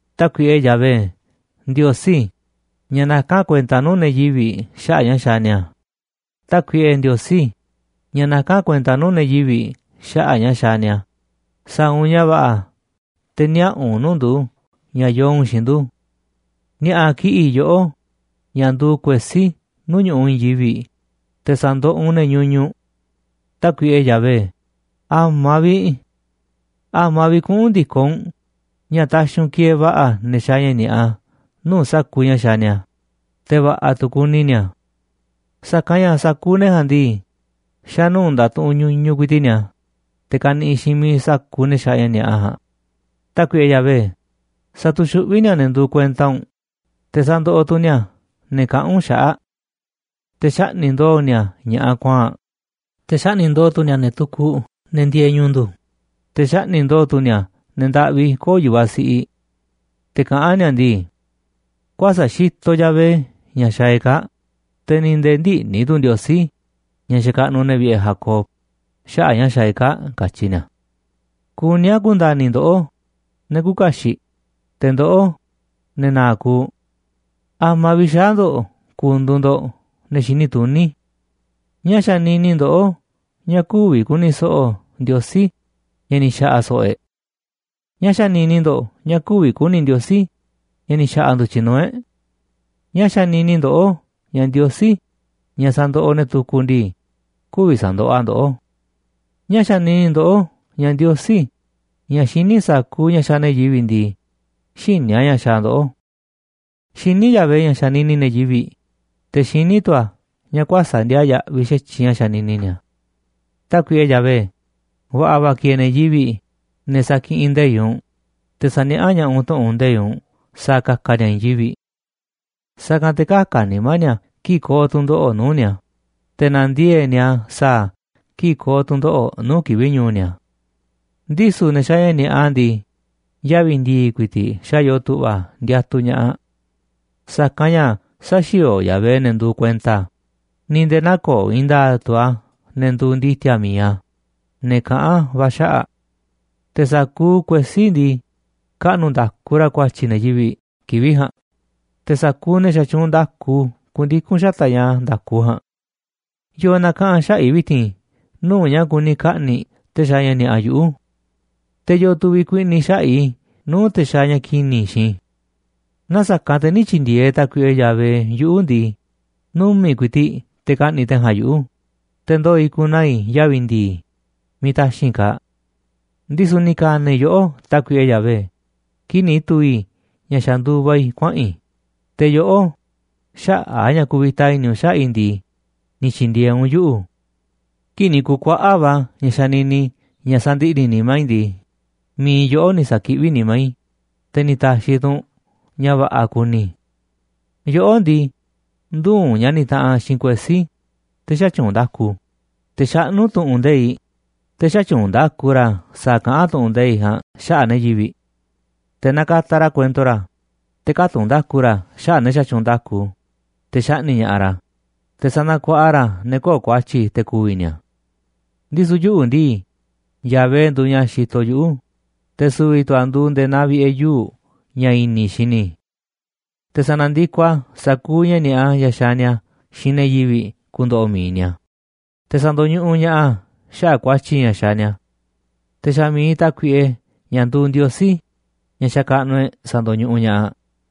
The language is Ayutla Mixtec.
Tákuiꞌe Yahvé, Ndiosí ña̱ nakán kuenta nuu̱ꞌ ne̱ yivi̱ꞌ xaꞌa̱ꞌ ña̱ xaaꞌ ni̱a̱, Tákuiꞌe, Ndiosí ña̱ nakán kuenta nuu̱ꞌ ne̱ yivi̱ꞌ xaꞌa̱ꞌ ña̱ xaaꞌ ni̱a̱, sa̱a̱ u̱nꞌ ña̱ va̱ꞌa̱ te̱ niaꞌa̱ u̱nꞌ nuu̱ꞌ ndu̱ ña̱ yoo u̱nꞌ xiinꞌ ndu̱. Ni̱a̱ꞌa̱ kiꞌi̱ꞌ yoꞌó, ña̱ nduuꞌ kuesí nuu̱ꞌ ñu̱ꞌuꞌ i̱i̱n yivi̱ꞌ, te̱ sa̱ndoꞌoꞌ u̱nꞌ ne̱ ñuñuꞌ. Tákuiꞌe Yahvé, ¿a̱ma̱ vi̱ꞌ? ¿A̱ma̱ vi̱ꞌ kuꞌu̱n ndi̱koꞌ u̱nꞌ ña̱ taxiꞌ u̱nꞌ kieeꞌ va̱ꞌa̱ ne̱ xaaꞌ ña̱ ni̱a̱ꞌa nuu̱ꞌ sa̱kuuꞌ ña̱ xaaꞌ ni̱a̱, te̱ va̱ꞌa̱ tu̱ kuni ni̱a̱? Sa̱kanꞌ ña̱ sa̱kuuꞌ ne̱ ja̱a̱nꞌ ndii, xa̱ nuu̱ꞌ ndatuꞌunꞌ ñuñuꞌ ku̱i̱ti̱ꞌ ni̱a̱, te̱ kaniꞌiꞌ xiinꞌ miiꞌ sa̱kuuꞌ ne̱ xaaꞌ ña̱ ni̱a̱ꞌa ja̱a̱nꞌ. Tákuiꞌe Yahvé, satuxuꞌví ni̱a̱ ne̱ nduuꞌ kuenta u̱nꞌ, te̱ sandoꞌoꞌ tu̱ ni̱a̱ ne̱ kaꞌán u̱nꞌ xaꞌa̱ꞌ. Te̱ xaꞌni̱ꞌ ndo̱o̱ ni̱a̱ ña̱ꞌaꞌ kuaa̱nꞌ, te̱ xaꞌni̱ꞌ ndo̱o̱ tu̱ ni̱a̱ ne̱ tukuꞌ, ne̱ ndieeꞌ ñu̱u̱ ndu̱, te̱ xaꞌni̱ꞌ ndo̱o̱ tu̱ ni̱a̱ ne̱ ndaꞌvi köo̱ꞌ yu̱vaꞌ siꞌiꞌ. Te̱ kaꞌán ni̱a̱ ndii: “Kuäsa̱ꞌ xitoꞌ Yahvé ña̱ xaaꞌ e̱ꞌ kaa̱ꞌ, te̱ ni̱ nde̱e̱ ndïꞌni̱ tu̱ Ndiosí, ña̱ xakaꞌnuꞌ ne̱ vi̱ꞌe̱ Jacob, xaꞌa̱ꞌ ña̱ xaaꞌ e̱ꞌ kaa̱ꞌ”, katyi ni̱a̱. Kuní a̱ ku̱nda̱ni̱ ndoꞌó, ne̱ küuꞌ kaxiꞌ, te̱ ndoꞌó, ne̱ na̱a̱ꞌ kuuꞌ, ¿a̱ma̱ vi̱ꞌ xaa̱ ndo̱ꞌ ku̱ndu̱u̱ ndo̱ꞌ ne̱ xini tuní? ¿Ñáá xanini ndoꞌó ña̱ kü̱vi̱ ku̱ni̱ so̱ꞌo̱ Ndiosí ña̱ ni̱ xa̱ꞌa̱ so̱ꞌo̱ e̱ꞌ? ¿Ñáá xanini ndo̱ꞌ ña̱ kü̱vi̱ ku̱ni̱ Ndiosí ña̱ ni̱ xa̱ꞌa̱ ndu̱tyiꞌ nuu̱ꞌ e̱ꞌ? ¿Ñáá xanini ndoꞌó ña̱ Ndiosí, ña̱ sa̱ndoꞌoꞌ ne̱ tukuꞌ ndii, kü̱vi̱ sa̱ndoꞌoꞌ a̱ ndoꞌó? ¿Ñáá xanini ndoꞌó ña̱ Ndiosí, ña̱ xiní sa̱kuuꞌ ña̱ xaaꞌ ne̱ yivi̱ꞌ ndii, xïní a̱ ña̱ xaaꞌ ndoꞌó? Xiní Yahvé ña̱ xanini ne̱ yivi̱ꞌ, te̱ xiní tu̱ a̱ ña̱ kuäsa̱ꞌ ndiaa yaꞌviꞌ xa̱tyiꞌ ña̱ xanini ni̱a̱. Tákuiꞌe Yahvé, va̱ꞌa̱ va̱ kieeꞌ ne̱ yivi̱ꞌ, ne̱ sakiꞌinꞌ nde̱iꞌ u̱nꞌ, te̱ saniaꞌá ña̱ꞌaꞌ u̱nꞌ tu̱ꞌu̱n nde̱iꞌ u̱nꞌ sa̱a̱ ka̱ka̱ ni̱a̱ i̱i̱n yivi̱ꞌ. Sa̱kanꞌ te̱ kä̱ka̱ nimá ni̱a̱ kii̱ꞌ ko̱o̱ tu̱ndoꞌo̱ꞌ nuu̱ꞌ ni̱a̱, te̱ na̱ndiee̱ꞌ ni̱a̱ sa̱a̱ a̱ kii̱ꞌ ko̱o̱ tu̱ndoꞌo̱ꞌ nuu̱ꞌ kivi̱ꞌ ñu̱u̱ ni̱a̱. Ndisu̱ ne̱ xaaꞌ ña̱ ni̱a̱ꞌa ndii, yavi̱ ndi̱i̱ ku̱i̱ti̱ꞌ xa̱ yoo tu̱ꞌva̱ ndiatuꞌ ña̱ꞌaꞌ. Sa̱kanꞌ ña̱ sä̱xi̱o̱o̱ Yahvé ne̱ nduuꞌ kuenta a̱, ni̱ nde̱e̱ nä̱ko̱o̱ i̱i̱n nda̱a̱ꞌ tu̱ a̱ ne̱ nduuꞌ ndi̱ti̱a̱ mi̱iꞌ a̱, ne̱ kaꞌán va̱ a̱ xaꞌa̱ꞌ. Te̱ sa̱kuuꞌ kuesí ndii, kaꞌnu̱ nda̱ku ra̱ ku̱a̱tyi̱ ne̱ yivi̱ꞌ kivi̱ꞌ ja̱a̱nꞌ, te̱ sa̱kuuꞌ ne̱ xatyuunꞌ nda̱ku ku̱ndiku̱n xata̱ꞌ ña̱ nda̱ku ja̱a̱nꞌ. ¿Yo̱o̱ na̱kaꞌa̱n xaꞌa̱ꞌ i̱ vi̱ti̱n nuu̱ꞌ ña̱ kuni ka̱ꞌni̱ꞌ te̱ xaaꞌ ña̱ ni̱a̱ꞌa yuꞌu̱? ¿Te̱ yo̱o̱ tu̱ vi̱kuiꞌni̱ xaꞌa̱ꞌ i̱ nuu̱ꞌ te̱ xaaꞌ ña̱ ki̱ni̱ xiinꞌ i̱? Naaꞌ sa̱kanꞌ te̱ nï̱ tyi̱ndi̱e̱eꞌ Tákuiꞌe Yahvé yuꞌu̱ ndii, numi̱ꞌ ku̱i̱ti̱ꞌ te̱ ka̱ꞌni̱ꞌ te̱ ja̱a̱nꞌ yuꞌu̱, te̱ ndoo̱ i̱ ku̱naa̱ i̱ yavi̱ ndii, miiꞌ taxi̱nꞌ kaaꞌ. Ndisu̱ ni̱ ka̱na̱ i̱ yoꞌó, Tákuiꞌe Yahvé, kii̱ꞌ ni̱ tu̱u̱ i̱ ña̱ xa̱ nduva i̱ kuaꞌa̱n i̱, te̱ yoꞌó, xaꞌa̱ꞌ a̱ ña̱ kuvita va̱ i̱ni̱ u̱nꞌ xaꞌa̱ꞌ i̱ ndii, ni̱ tyi̱ndi̱e̱eꞌ u̱nꞌ yuꞌu̱. Kii̱ꞌ ni̱ ku̱kuaꞌa̱ꞌ va̱ ña̱ xanini ña̱ sandiꞌni̱ nimá i̱ ndii, mi̱iꞌ yoꞌó ni̱ sa̱kiꞌví nimá i̱, te̱ ni̱ ta̱xi̱ tu̱ u̱nꞌ ña̱ va̱ꞌa̱ kuni i̱. Yoꞌó ndii, ndüuꞌ u̱nꞌ ña̱ nitaꞌanꞌ xiinꞌ kuesí, te̱ xätyuunꞌ nda̱ku, te̱ xaꞌnú tu̱ꞌu̱n nde̱iꞌ, te̱ xätyuunꞌ nda̱ku ra̱ sa̱a̱ kaꞌán tu̱ꞌu̱n nde̱iꞌ ja̱a̱nꞌ xaꞌa̱ꞌ ne̱ yivi̱ꞌ. Te̱ nakataꞌ ra̱ kuento ra̱, te̱ kätunꞌ nda̱ku ra̱ xaꞌa̱ꞌ ne̱ xatyuunꞌ nda̱ku, te̱ xaꞌni̱ꞌ ña̱ꞌaꞌ ra̱, te̱ sanakuaꞌa ra̱ ne̱ köo̱ꞌ ku̱a̱tyi̱ te̱ ku̱vi̱ ni̱a̱. Ndisu̱ yuꞌu̱ ndii, Yahvé nduuꞌ ña̱ xitoꞌ yuꞌu̱, te̱ su̱vi̱ tu̱ a̱ nduuꞌ nde̱e̱ naa vi̱ꞌe̱ yuu̱ꞌ ña̱ i̱ni̱ i̱ xini i̱. Te̱ sa̱na̱ndikoꞌ a̱ sa̱kuuꞌ ña̱ ni̱a̱ꞌa ña̱ xaaꞌ ni̱a̱ xiinꞌ ne̱ yivi̱ꞌ ku̱ndo̱ꞌo̱ mi̱iꞌ ni̱a̱, te̱ sa̱ndo̱ñuꞌuꞌ ña̱ꞌaꞌ a̱ xaꞌa̱ꞌ ku̱a̱tyi̱ ña̱ xaaꞌ ni̱a̱. Te̱ xa̱ mi̱iꞌ Tákuiꞌe, ña̱ nduuꞌ Ndiosí, ña̱ xakaꞌnuꞌ e̱ꞌ, sa̱ndo̱ñuꞌuꞌ ña̱ꞌaꞌ.